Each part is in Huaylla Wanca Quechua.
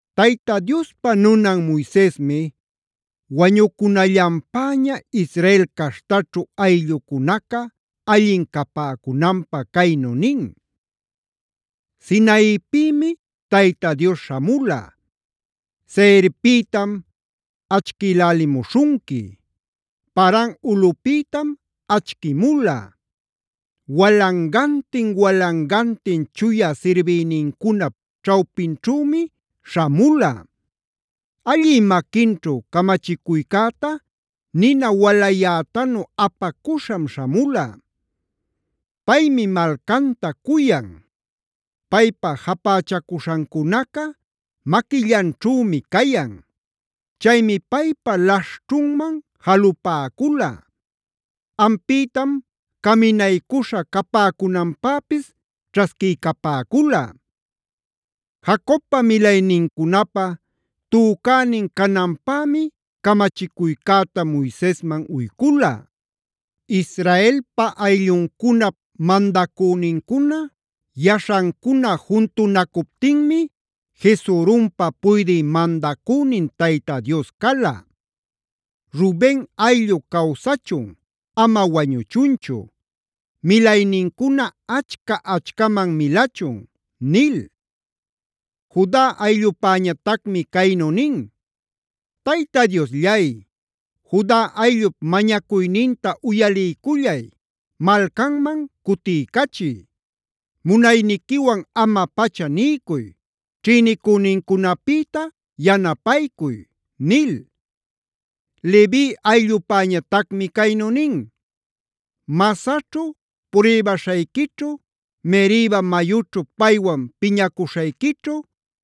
Tayta Diospa nunan Moisesmi wañucunallanpäña Israel caśhtaćhu ayllucunaca allin capäcunanpä caynu nin: “Sinaipïmi Tayta Dios śhamula; Seirpïtam achquilälimuśhunqui. Paran ulꞌüpïtam achquimula; walangantin-walangantin chuya sirbïnincunap ćhawpinćhümi śhamula; allï maquinćhu camachicuycäta nina walayätanu apacuśham śhamula. Paymi malcanta cuyan. Paypa japächacuśhancunaca maquillanćhümi cayan. Chaymi paypa laśhćhunman jalupäcula; ampïtam caminaycuśha capäcunanpäpis ćhasquiycapäcula. Jacobpa milaynincunapa tücänin cananpämi camachicuycäta Moisesman uycula. Israelpaa aylluncunap mandacünincuna, yaśhancuna juntunacuptinmi Jesurunpa puydï mandacünin Tayta Dios cala. Ruben ayllu cawsachun, ama wañuchunchu; milaynincuna achca-achcaman milachun” nil. Juda ayllupäñatacmi caynu nin: “Tayta Diosllay, Juda ayllup mañacuyninta uyaliycullay, malcanman cutiycachiy. Munayniquiwan ama-pacha niycuy, ćhïnicünincunapïta yanapaycuy” nil. Levi ayllupäñatacmi caynu nin: “Masahćhub pruybaśhayquićhu, Meribac mayućhu paywan piñacuśhayquićhu,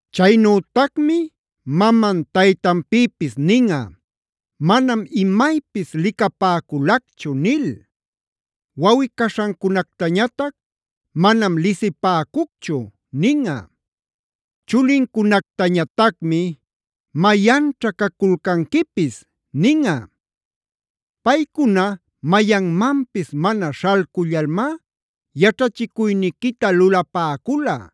Chaynütacmi maman taytanpïpis ninꞌa: ‘Manam imaypis licapäculacchu’ nil. Wawꞌi-caśhancunactañatac: ‘Manam lisipäcucchu’ ninꞌa. Chulincunactañatacmi: ‘Mayanćha caculcanquipis’ ninꞌa. Paycuna mayanmanpis mana śhalcullalmá yaćhachicuyniquita lulapäcula,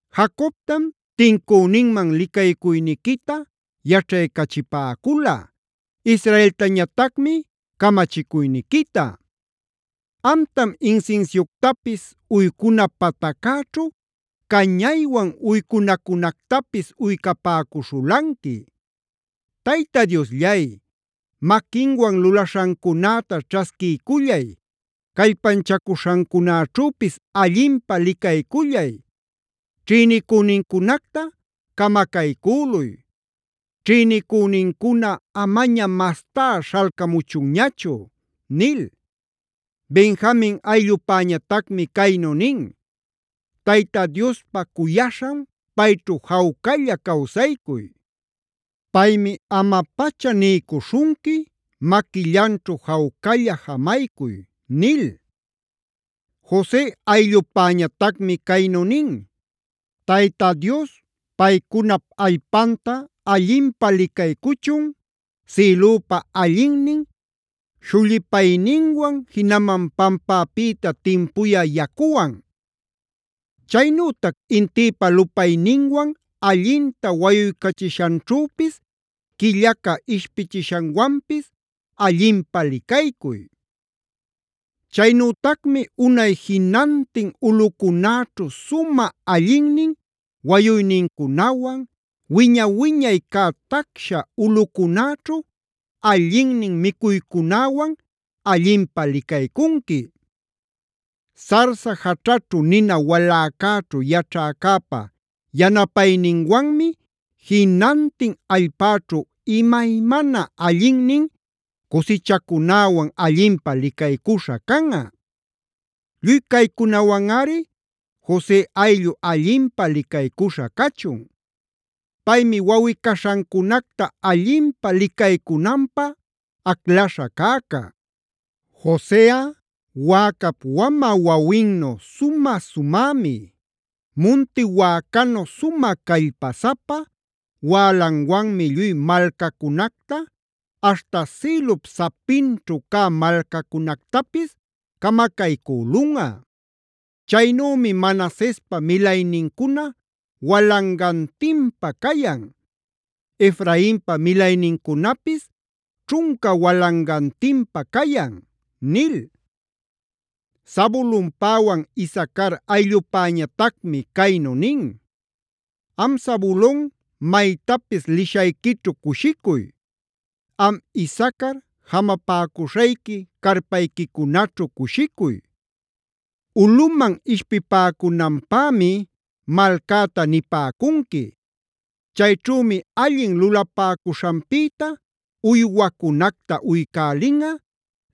Jacobtam tincüninman licaycuyniquita yaćhaycachipäcula, Israeltañatacmi camachicuyniquita. Amtam insinsiuctapis, uycuna pataccäćhu cañaywan uycunacunactapis uycapäcuśhulanqui. Tayta Diosllay, maquinwan lulaśhancunäta ćhasquiycullay, callpanchacuśhancunäćhüpis allinpä licaycullay. Ćhïnicünincunacta camacaycüluy; ćhïnicünincuna amaña mastá śhalcamuchunñachu” nil. Benjamin ayllupäñatacmi caynu nin: “Tayta Diospa cuyaśhan, payćhu jawcalla cawsaycuy. Paymi ama-pacha niycuśhunqui, maquillanćhu jawcalla jamaycuy” nil. Jose ayllupäñatacmi caynu nin: “Tayta Dios paycunap allpanta allinpä licaycuchun,f sïlupa allinnin shullipayninwan, jinaman pampäpïta timpuya yacuwan. Chaynütac intïpa lupayninwan allinta wayuycachishanćhüpis, quillaca ishpichishanwanpis allinpä licaycuy. Chaynütacmi unay jinantin ulꞌucunäćhu sumä allinnin wayuynincunawan, wiña-wiñay cä tacsha ulꞌucunäćhu allinnin micuycunäwan allinpä licaycunqui. Sarsa jaćhaćhu nina waläcäćhu yaćhäcäpa yanapayninwanmi jinantin allpäćhu imaymana allinnin cusichacunäwan allinpä licaycuśha canꞌa. Lluy caycunawanꞌari Jose ayllu allinpä licaycuśha cachun. Paymi wawꞌi-caśhancunacta allinpä licaycunanpä aclaśha cäca. Joseꞌa wäcap wamä wawinnu sumä-sumämi; munti wäcanu sumä callpasapa, wälanwanmi lluy malcacunacta aśhta sïlup sapinćhu cä malcacunactapis camacaycülunꞌa. Chaynümi Manasespa milaynincuna walangantinpa cayan; Efrainpa milaynincunapis ćhunca walangantinpa cayan” nil. Zabulonpäwan Isacar ayllupäñatacmi caynu nin: “Am Zabulon maytapis lishayquićhu cushicuy; Am Isacar jamapäcuśhayqui carpayquicunaćhu cushicuy. Ulꞌuman ishpipäcunanpämi malcäta nipäcunqui. Chayćhümi allin lulapäcuśhanpïta uywacunacta uycälinꞌa,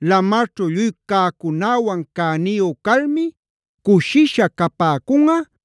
lamarćhu lluy cäcunäwan cäniyu calmi cushisha capäcunꞌa,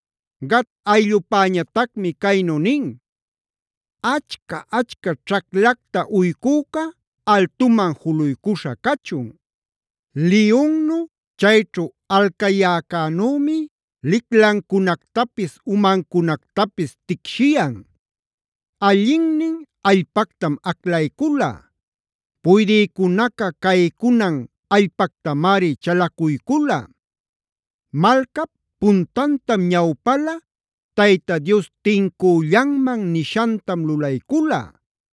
Gad ayllupäñatacmi caynu nin: “¡Achca-achca ćhaclacta uycüca altuman juluycuśha cachun! Liyunnu chayćhu alcayäcänümi liclancunactapis umancunactapis ticshiyan. Allinnin allpactam aclaycula; puydïcunaca caycunan allpactamari chalacuycula. Malcap puntantam ñawpala, Tayta Dios tincüllanman nishantam lulaycula;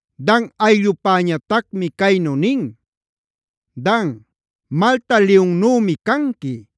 Dan ayllupäñatacmi caynu nin: “Dan, malta liyunnümi canqui;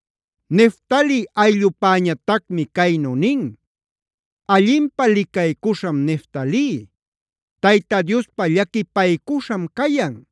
Neftali ayllupäñatacmi caynu nin: “Allinpä licaycuśham Neftali; Tayta Diospa llaquipaycuśham cayan.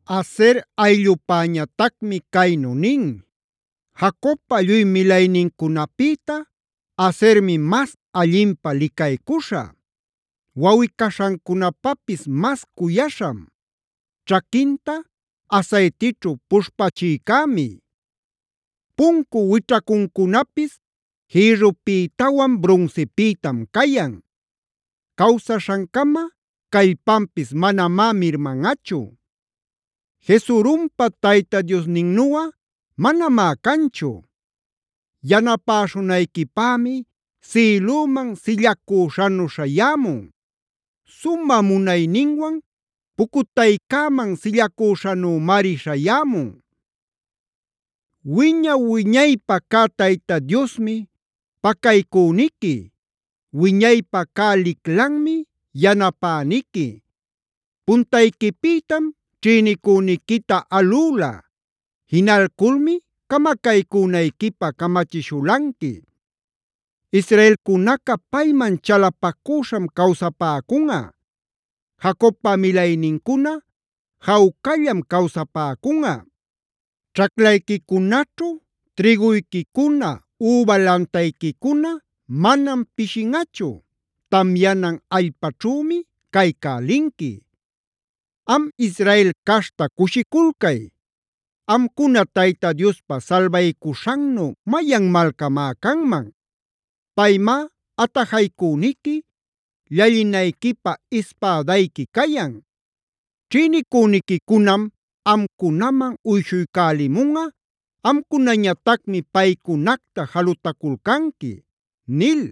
Aser ayllupäñatacmi caynu nin: “Jacobpa lluy milaynincunapïta Asermi mas allinpä licaycuśhä. Wawꞌi-caśhancunapapis mas cuyaśham; ćhaquinta asaytićhu puśhpachïcämi. Puncu wićhacuncunapis jïrrupïtawan brunsipïtam cayan. Cawsaśhancama callpanpis manamá mirmanꞌachu. “Jesurunpa Tayta Diosninnuꞌa manamá canchu. Yanapäśhunayquipämi sïlüman sillacüśhanu śhayämun; sumä munayninwan pucutaycäman sillacüśhanümari śhayämun. Wiña-wuñaypä cä Tayta Diosmi pacaycüniqui. Wiñaypa cä liclanmi yanapäniqui. Puntayquipïtam ćhïnicüniquita alüla; jinalculmi camacaycünayquipä camachishulanqui. Israelcunaca payman chalapacüśham cawsapäcunꞌa; Jacobpa milaynincuna jawcallam cawsapäcunꞌa. Ćhaclayquicunaćhu trïguyquicuna üba lantayquicuna manam pishinꞌachu, tamyanan allpaćhümi caycälinqui. Am Israel caśhta cushiculcay. ¿Amcuna Tayta Diospa salbaycuśhannu mayan malcamá canman? Paymá atajaycüniqui, llallinayquipä ispädayqui cayan. Ćhïnicüniquicunam amcunaman uyshuycälimunꞌa, amcunañatacmi paycunacta jalutaculcanqui” nil.